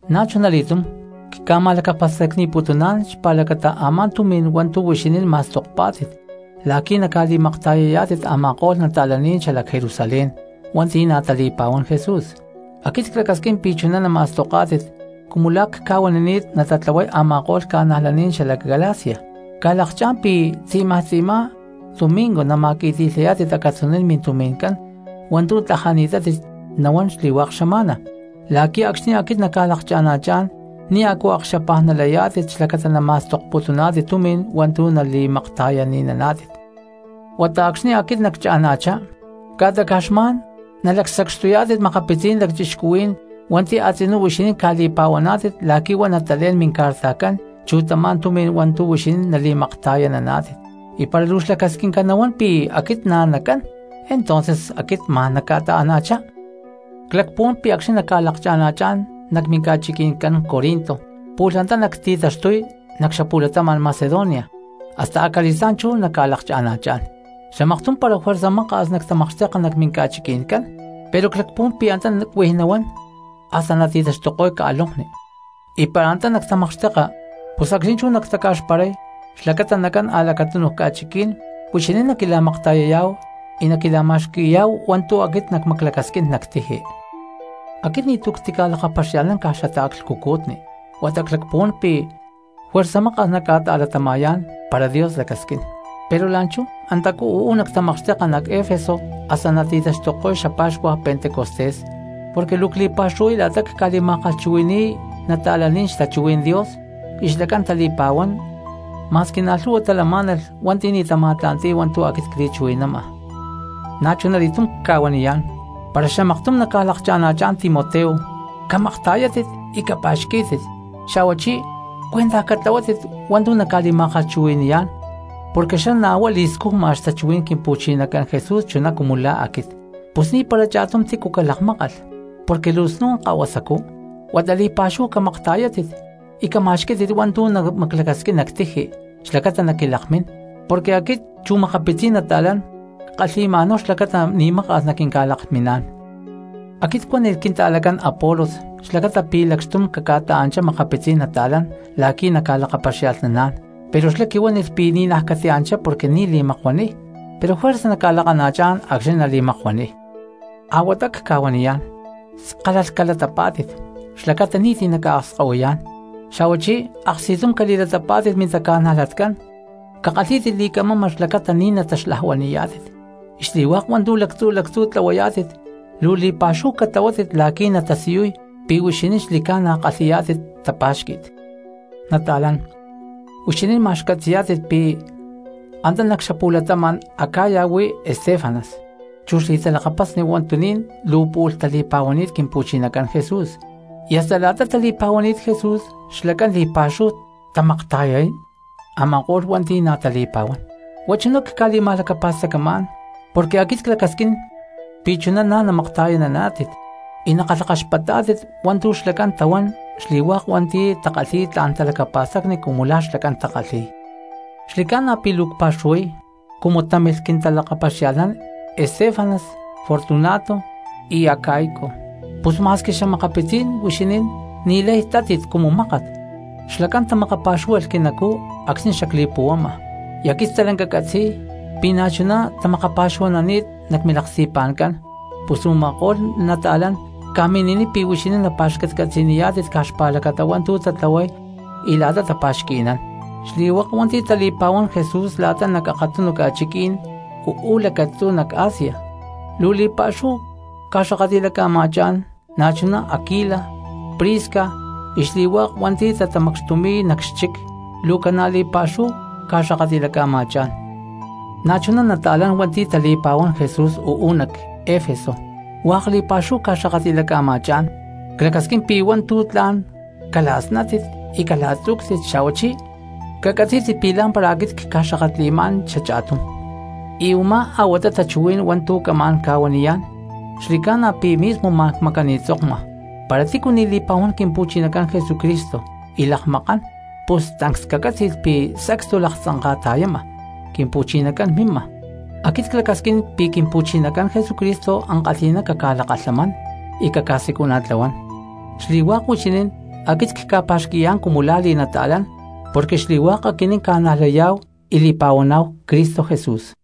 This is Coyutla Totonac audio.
Na̠chunali̠túm cca̠ma̠lacapa̠stacni̠putuná̠n xpa̠lacata a̠má tumi̠n hua̠ntu̠ huixinín ma̠stokpá̠tit la̠qui̠ naca̠li̠makta̠yayá̠tit a̠ma̠ko̠lh cristianos xalac Jerusalén hua̠nti̠ na̠ tali̠pa̠huán Jesús. Aquit clacasquín pi̠ chuná nama̠stoká̠tit cumu la̠ cca̠huanini̠t natatlahuay a̠ma̠ko̠lh ca̠najlaní̠n xalac Galacia. Ca̠lakcha̠ná̠n pi̠ tzi̠maj tzi̠má domingo nama̠qui̠ti̠lhayá̠tit acatzuní̠n mintumi̠ncán hua̠ntu̠ tlajani̠tátit nahuán xli̠hua̠k xama̠na la̠qui̠ acxni̠ aquit nacca̠lakana̠chá̠n ni̠ a̠cu akaxapaj nalayá̠tit xlacata nama̠stokputuná̠tit tumi̠n hua̠ntu̠ nali̠makta̠yananá̠tit. Huata acxni̠ aquit naccha̠na̠chá ca̠ta caj xma̠n nalacsacxtuyá̠tit makapitzí̠n lacchixcuhuí̠n hua̠nti̠ a̠tzinú huixinín ca̠li̠pa̠huaná̠tit la̠qui̠ huá natalé̠n mincartajcán chu tamá tumi̠n hua̠ntu̠ huixinín nali̠makta̠yananá̠tit. Y para luu xlacasquinca nahuán pi̠ aquit na̠ nacán entonces aquit ma̠n nacca̠ta̠ana̠chá. Clacpuhuán pi̠ acxni̠ nacca̠lakana̠chá̠n nac minca̠chiqui̠ncán Corinto pu̠lh antá nacti̠taxtuy nac xapu̠latama̠n Macedonia, hasta acali̠stá̠n chú nacca̠lakcha̠na̠chá̠n. Xamaktum para juerza maka̠s nactamakxteka nac minca̠chiqui̠ncán, pero clacpuhuán pi̠ antá cuij nahuán hasta nati̠taxtuko̠y ca̠lonkni. Y para antá nactamakxteka pus acxni̠ chú nactaca̠xparay xlacata nacán a̠lacatunu ca̠chiquí̠n huixinín naquila̠makta̠yayá̠hu y naquila̠ma̠xqui̠yá̠hu hua̠ntu̠ aquit nacmaclacasquín nac tiji. Aquit ni̠tu̠ cca̠ti̠lakapaxia̠lhnamá̠n caj xataaclhcucutni huata clacpuhuán pi̠ juerza maka̠s nacca̠ta̠latama̠yá̠n, para Dios lacasquín. Pero la̠nchú antacú uu̠ nactamakxteka nac Efeso hasta nati̠taxtuko̠y xapa̠xcuaj pentecostés. Porque luu cli̠pa̠xuhuay la̠ta cca̠li̠ma̠kalhchuhui̠ni̠y cristianos xtachuhuí̠n Dios y xlacán tali̠pa̠huán, ma̠squi na̠ lhu̠hua talamá̠nalh hua̠nti̠ ni̠ tama̠tla̠nti̠y hua̠ntu̠ aquit cli̠chuhui̠nama. Na̠chunali̠túm cca̠huaniyá̠n para xamaktum naca̠lakcha̠na̠chá̠n Timoteo, camakta̠yátit y capa̠xquí̠tit, xa̠huachí cuentaj catlahuátit hua̠ntu̠ naca̠li̠ma̠kalhchuhui̠ni̠yá̠n porque xlá na̠ huá li̠scujma xtachuhuí̠n Quimpu̠chinacán Jesús chuná cumu la̠ aquit. Pus ni̠para cha̠tum tícu calakmákalh porque luu snu̠n kahuasacú, huata li̠pa̠xúhu camakta̠yátit y cama̠xquí̠tit hua̠ntu̠ namaclacasquín nac tiji xlacata naquilakmín porque aquit chu xa̠makapitzí̠n nata̠lán ckalhi̠ma̠náhu xlacata ni̠maka̠s naquinca̠lakminá̠n. Aquit cuánilh quinta̠lacán Apolos xlacata pi̠ lacxtum caca̠ta̠anchá makapitzí̠n nata̠lán la̠qui̠ naca̠lakapaxia̠lhnaná̠n, pero xlá quihuánilh pi̠ ni̠naj catianchá porque ni̠ li̠makuaniy, pero juerza naca̠lakana̠chá̠n acxní nali̠makuaniy. Ahuatá cca̠huaniyá̠n, skálalh calatapá̠tit xlacata ni̠ti̠ naca̠akskahuiyá̠n xa̠ hua chí aksti̠tum cali̠latapá̠tit mintaca̠najlatcán, cakalhí̠tit li̠camama xlacata ni̠ nataxlajuani̠yá̠tit. Y xli̠hua̠k hua̠ntu̠ lactzu̠ lactzú tlahuayá̠tit luu li̠pa̠xúhu catlahuátit la̠qui̠ natasiyuy pi̠ huixinín xli̠ca̠na kalhi̠yá̠tit tapa̠xqui̠t. Nata̠lán, huixinín ma̠x catzi̠yá̠tit pi̠ antá nac xapu̠latama̠n Acaya huá Estéfanas chu xli̠talakapasni huatuní̠n luu pu̠lh tali̠pá̠hualh Quimpu̠chinacán Jesús, y hasta la̠ta tali̠pa̠huani̠t Jesús xlacán li̠pa̠xúhu tamakta̠yay a̠ma̠ko̠lh hua̠nti̠ na̠ tali̠pa̠huán. Huá chuná cca̠li̠ma̠lacapa̠stacamá̠n porque aquit clacasquín pi̠ chuná na̠ namakta̠yananá̠tit y naca̠kalhakaxpatá̠tit hua̠ntu̠ xlacán tahuán xli̠hua̠k hua̠nti̠ takalhi̠y tla̠n talacapa̠stacni cumu la̠ xlacán takalhi̠y. Xli̠ca̠na pi̠ luu cpa̠xuhuay cumu támilh quintalakapaxia̠lhnán Estéfanas, Fortunato y Acaico, pus ma̠squi xa̠makapitzí̠n huixinín ni̠lay ta̠tátit cumu mákat. Xlacán tamakapa̠xúhualh quinacú acxni̠ xacli̠puhuama, y aquit stalanca ccatzi̠y pi̠ na̠chuná tamakapa̠xuhua̠nani̠t nac milaksti̠pa̠ncán; pus u̠ma̠ko̠lh cristianos ca̠mini̠niy pi̠ huixinín naca̠pa̠xcatcatzi̠niyá̠tit caj xpa̠lacata hua̠ntu̠ tatlahuay y la̠ta tapa̠xqui̠nán. Xli̠hua̠k hua̠nti̠ tali̠pa̠huán Jesús la̠ta nac akatunu ca̠chiquí̠n uú lacatzú nac Asia luu li̠pa̠xúhu ca̠xakatli̠laca̠ma̠chá̠n. Na̠chuná Aquila, Prisca y xli̠hua̠k hua̠nti̠ tatamacxtumi̠y nac xchic luu ca̠na̠ li̠pa̠xúhu ca̠xakatli̠laca̠ma̠chá̠n. Na̠chuná cristianos hua̠nti̠ tali̠pa̠huán Jesús uú nac Efeso hua̠k li̠pa̠xúhu ca̠xakatli̠laca̠ma̠chá̠n. Clacasquín pi̠ hua̠ntu̠ tla̠n cala̠snátit y cala̠tzú̠ctit xa̠huachí cacatzí̠tit pi̠ lá̠mpara aquit cca̠xakatli̠má̠n xacha̠tum. Y u̠má a̠huata tachuhuí̠n hua̠ntu̠ camá̠n ca̠huaniyá̠n, xli̠ca̠na pi̠ mismo ma̠n cmacani̠tzokma. Para tícu ni̠ li̠pa̠huán Quimpu̠chinacán Jesucristo y lakmakán, pus tancs cacátzi̠lh pi̠ sacstu laktzanka̠ta̠yama. ¡Quimpu̠chinacán mima! Aquit clacasquín pi̠ Quimpu̠chinacán Jesucristo ankalhi̠ná caca̠lakalhamán y caca̠siculana̠tlahuán. Xli̠hua̠k huixinín aquit cca̠pa̠xqui̠yá̠n cumu lá li̠nata̠lán porque xli̠hua̠k aquinín ca̠najlaniyá̠hu y li̠pa̠huaná̠hu Cristo Jesús.